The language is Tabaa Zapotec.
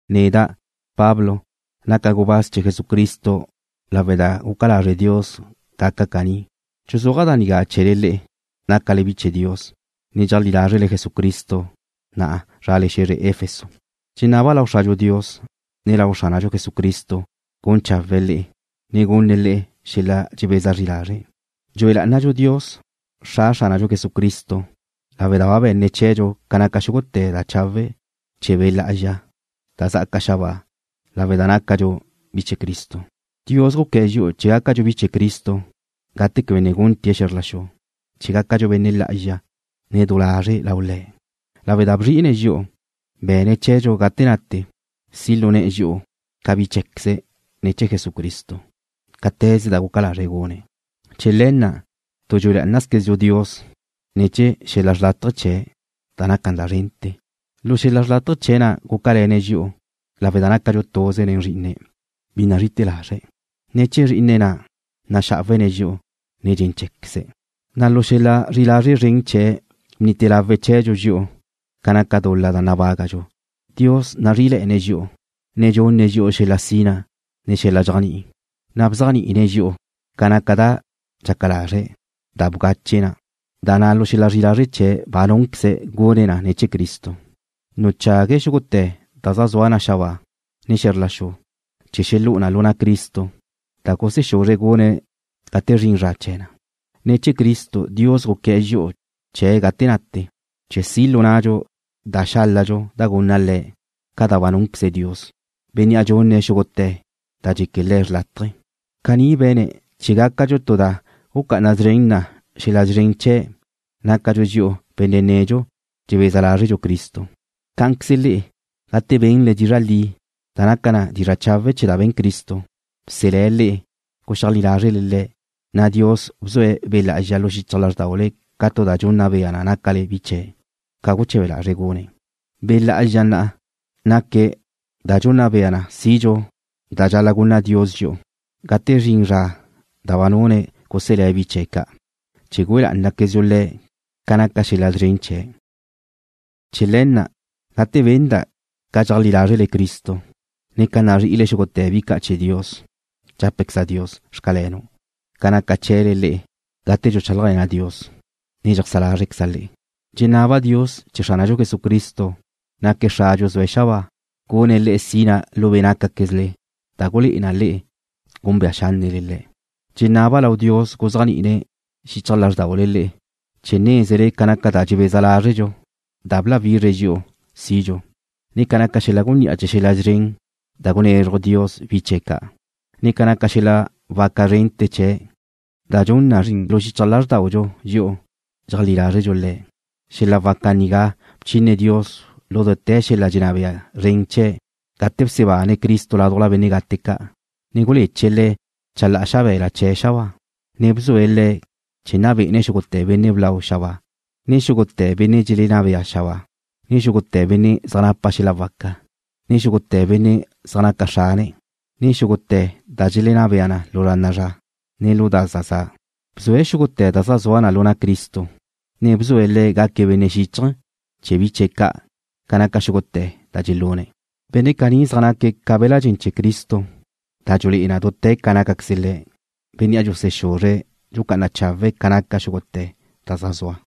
Neda', Pablo, naca' gubáz chee̱ Jesucristo lawe' da guca lazre' Dios gaca' caní. Dxuzúaja' da nigá chee̱le le'e, nácale bi chee̱ Dios, ne dxeajlí lázrele Jesucristo, na' zrale xe̱zre Éfeso. Dxenaba' lau Xradxu Dios, ne lau Xránadxu Jesucristo gun chawe̱'e̱ le'e, ne gunne̱' le'e xel-la dxebeza zri lazre'. Dxue lá'anadxu Dios, Xra Xránadxu Jesucristo lawe' da ba be̱ne̱' chee̱dxu ca naca xúgute̱ da chawe' chee̱ Be' Lá'azxa da zá'aca xabáa lawe' da nácadxu bi chee̱ Cristo. Dios guqué̱'e̱ dxi'u chee̱ gácadxu bi chee̱ Cristo gate quebe ne gunte̱' xe̱zr la xu, chee̱ gácadxu benne' lá'azxa, ne du lazre' lau Le̱'. Lawe' da bzri'ine̱' dxi'u, be̱ne̱' chee̱dxu gate nate si' lu ne̱'e̱ dxi'u ca bi cheé̱queze̱' ne̱ chee̱ Jesucristo, cáte̱ze da guca lazre̱' gune̱'. Chee̱ le̱ na', tu dxue lá'anazquezdxu Dios ne̱ chee̱ xel-la xrlátaje chee̱' da naca na szrente̱. Lu xel-la xrlátaje chee̱' na' gúcale̱ne̱' dxi'u lawe' da nácadxu tuze nen Zrí'ine̱', bi nazri'ite̱ lazre̱'. Ne̱ chee̱ Zrí'ine̱' na' naxá'awene̱' dxi'u nen dxen cheé̱queze̱', na' lu xel-la zri'i lazre' zren chee̱' bnite lawe̱' chee̱dxu dxi'u ca naca dul-la da nabágadxu. Dios nazrí'ile̱'e̱ne̱' dxi'u, ne dxunne̱' dxi'u xel-la sina, ne xel-la dxéajni'i, na' bzéajni'ine̱' dxi'u ca naca da dxaca lazre̱' da bgache na, da na' lu xel-la zri'i lazre' chee̱' ba núnqueze̱' gune̱' ne̱ chee̱ Cristo. Nuchague̱' xúgute̱ da zaj zua na xabáa, ne xe̱zr la xu, chee̱ xelú'u na lu na' Cristo, da gusexúzre̱' gune̱' gate zrin zra chee̱ na. Ne̱ chee̱ Cristo Dios guqué̱'e̱ dxi'u chee̱' gate nate, chee̱ si' lu nnadxu da xáladxu da gunna Le̱', ca da ba núnqueze Dios, Bénnea' dxune̱' xúgute̱ da dxeque Le̱' xrlátaje. Caní be̱ne̱' chee̱ gácadxu tu da gucá'ana szren na xel-la szren chee̱', nácadxu dxi'u benne' nedxu dxebeza lázredxu Cristo. Cá'anqueze le'e, gate benle dizra' li, da naca na dizra' chawe' chee̱ da be̱n Cristo, bselé̱' le'e. Guxeajlí lázrele Le̱', na' Dios bzue̱' Be' Lá'azxa lu xichaj lázrdaule ca tu da dxunna bea na nácale bi chee̱', ca guche̱be lazre̱' gune̱'. Be' Lá'azxa na' naque̱' da dxunna bea na sidxu da xáladxu da gunna Dios dxi'u, gate zrin zra da ba nune̱' guselé̱' bi chee̱' ca', chee̱ güe lá'anaquezdxu Le̱' ca naca xel-la szren chee̱'. Chee̱ le̱ na' gate benda' ca dxeajlí lázrele Cristo, ne ca nazri'ile xúgute̱ bi ca' chee̱ Dios, dxápaqueza' Dios; Xcalenu', ca naca chee̱le le'e gate dxuchálajle̱na' Dios, ne dxeajsá lázrqueza' le'e. Dxenaba' Dios chee̱ Xránadxu Jesucristo, naque̱' Xradxu zue̱' xabáa, gunne̱' le'e xel-la sina lu be' nácaquezle da gulé'e na le'e gúnbea xánnele Le̱'. Dxenaba' lau Dios guzéajni'ine̱ xichaj lázrdaule le'e chee̱ nézele ca naca da dxebeza lázredxu da bláwizre̱' dxi'u sidxu, ne ca naca xel-la gunní'a chee̱ xel-la szren da gunezruj Dios bi chee̱ ca', ne ca naca xel-la waca zrente̱ chee̱' da dxun na zrin lu xichaj lázrdaudxu dxi'u dxeajlí lázredxu Le̱'. Xel-la waca nigá bchine Dios lu dute̱ xel-la dxenná bea zren chee̱' gate bsebane̱' Cristo ládujla benne' gate ca', ne guleche̱' Le̱' chalá'a xabe̱la chee̱' xabáa, ne bzue̱' Le̱' chee̱ nna bé'ene̱' xúgute̱ benne' blau xabáa, ne xúgute̱ benne' dxelenná bea xabáa, ne xúgute̱ benne' zaj napa xel-la waca, ne xúgute̱ benne' zaj naca xrane, ne xúgute̱ da dxelenná bea na lu zra na'a zra, ne lu da za za'. Bzue̱' xúgute̱ da zaj zua lu na' Cristo, ne bzue̱' Le̱' gaque̱' benne' xíchaje̱ chee̱ bi chee̱ ca' ca naca xúgute̱ da dxelune̱'. Benne' caní zaj naque̱' ca be̱la' dxen chee̱ Cristo, da dxulé'e na dute̱ ca nácaqueze Le̱', Bénnea' dxusexuzre̱' dxucá'ana chawe̱' ca naca xúgute̱ da zaj zua.